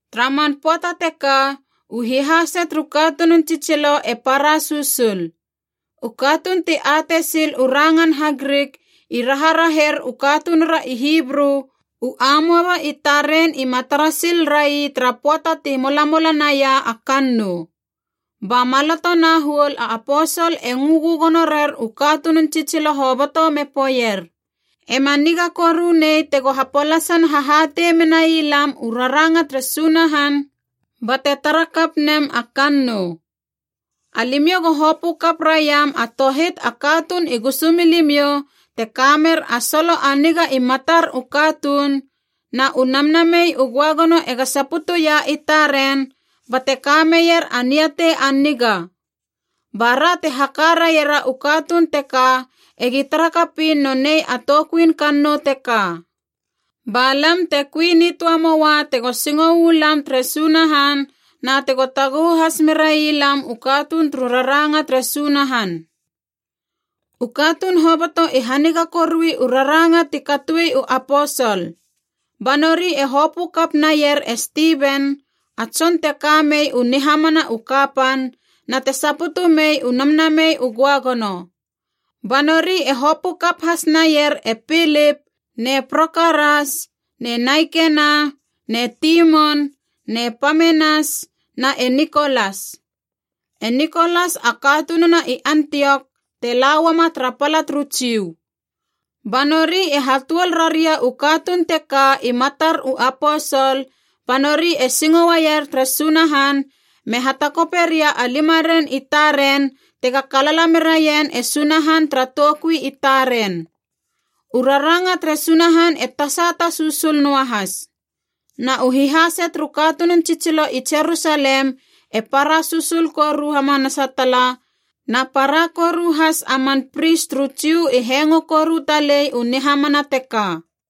Tara man pöata teka u hihase turu katunun tsitsilo e para susul. U katuun ti atei sil u rangan HaGrik i raharaher u katunura i Hibru u amoaba i taren ima tara sil rai tara pöata ti molamola naia a kannou. Ba maloto na huol a aposol e ngö gögono rer u katunun tsitsilo hoboto me poeier, “Ema niga koru nei tego hapolasan hahatei menai lam u raranga tere Sunahan bate tara kap nem a kannou. Alimiou go hopö kap raiam a tohit a katuun i gusumilimiou te ka mer a solo a niga i matar u katuun, na u Namnamei u Göagono ega saputuia i taren bate ka meier a niatei a niga. Ba ra te haka raiera u katuun teka egi tara kapiin nonei a toukuin kannou teka. Ba lam te kui nitöa moua tego singo u lam tere Sunahan na tego taguhu has merailam u katuun turu raranga tere Sunahan.” U katuun hoboto i haniga korui u raranga ti katoi u aposol. Ba nori e hopö kap naier e Stiven, a tson te ka mei u nihamana u kapan na te saputu mei u Namnamei u Göagono. Ba nori e hopö kap has naier e Pilip ne Prokoras ne Naikena ne Timon ne Pamenas na e Nikolas. E Nikolas a katununa i Antiok te la uama tara pala turu Jiu. Ba nori e hatuol raria u katuun teka i matar u aposol, ba nori e singo uaier tere Sunahan me hatakope ria a limaren i taren tega kalala meraien e Sunahan tara toukui i taren. U raranga tere Sunahan e tasata susul noahas. Na u hihase turu katunun tsitsilo i Jerusalem e para susul koru hamanasa tala, na para koru has a man pris turu Jiu i hengo koru talei u nihamana teka.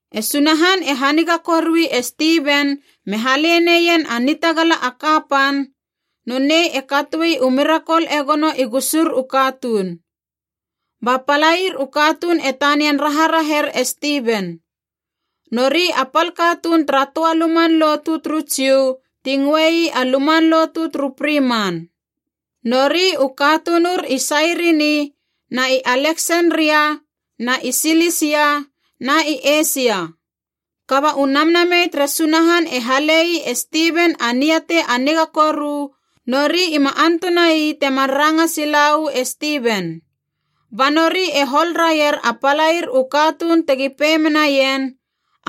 E Sunahan e haniga korui e Stiven me hale neien a nitagala a kapan, nonei e katoe u mirakol e gono i gusur u katuun. Ba palair u katuun e tanian raharaher e Stiven. Nori a pal katuun tara töa luman lotu turu Jiu ti ngöei a luman lotu turu Friman.a Nori u katunur i Sairini na i Aleksenria na i Silisia na i Eisia. Kaba u Namnamei tere Sunahan e hale ii e Stiven a niatei a niga koru, nori ima antuna ii temar ranga sila uu e Stiven. Ba nori e hol raier a palair u katuun tegi pei menaien,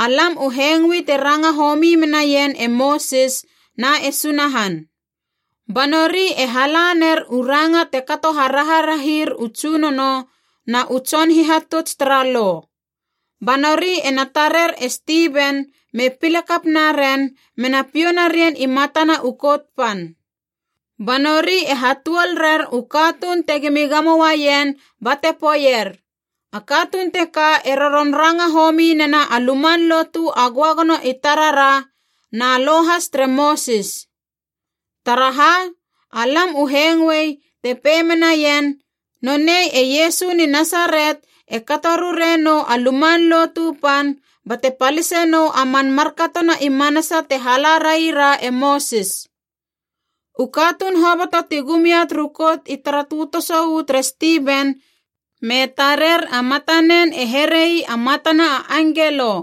“Alam u hengoi te ranga homi menaien e Mosis na e Sunahan!” Ba nori e hala ner u ranga te kato haraharahir u tsunono na u tson hihatuts tara Lo. Ba nori ena tarer e Stiven me pile kap naren mena piou narien i matana u Kout Pan. Ba nori e hatuol rer u katuun tegimi gamo uaien bate poeier, “A katuun teka e roron ranga homi nena a luman lotu a Göagono i tarara na Lo has tere Mosis. Taraha, alam u hengoei te pei menaien, ‘Nonei e Iesu ni Nasaret e kato rure nou a Luman Lotu Pan bate palise nou a man markatona i manasa te hala raira e Mosis!’” U katuun hoboto ti gum ia turu Kout i tara tötoso uu tere Stiven me tarer a matanen e here ii a matana a angelo.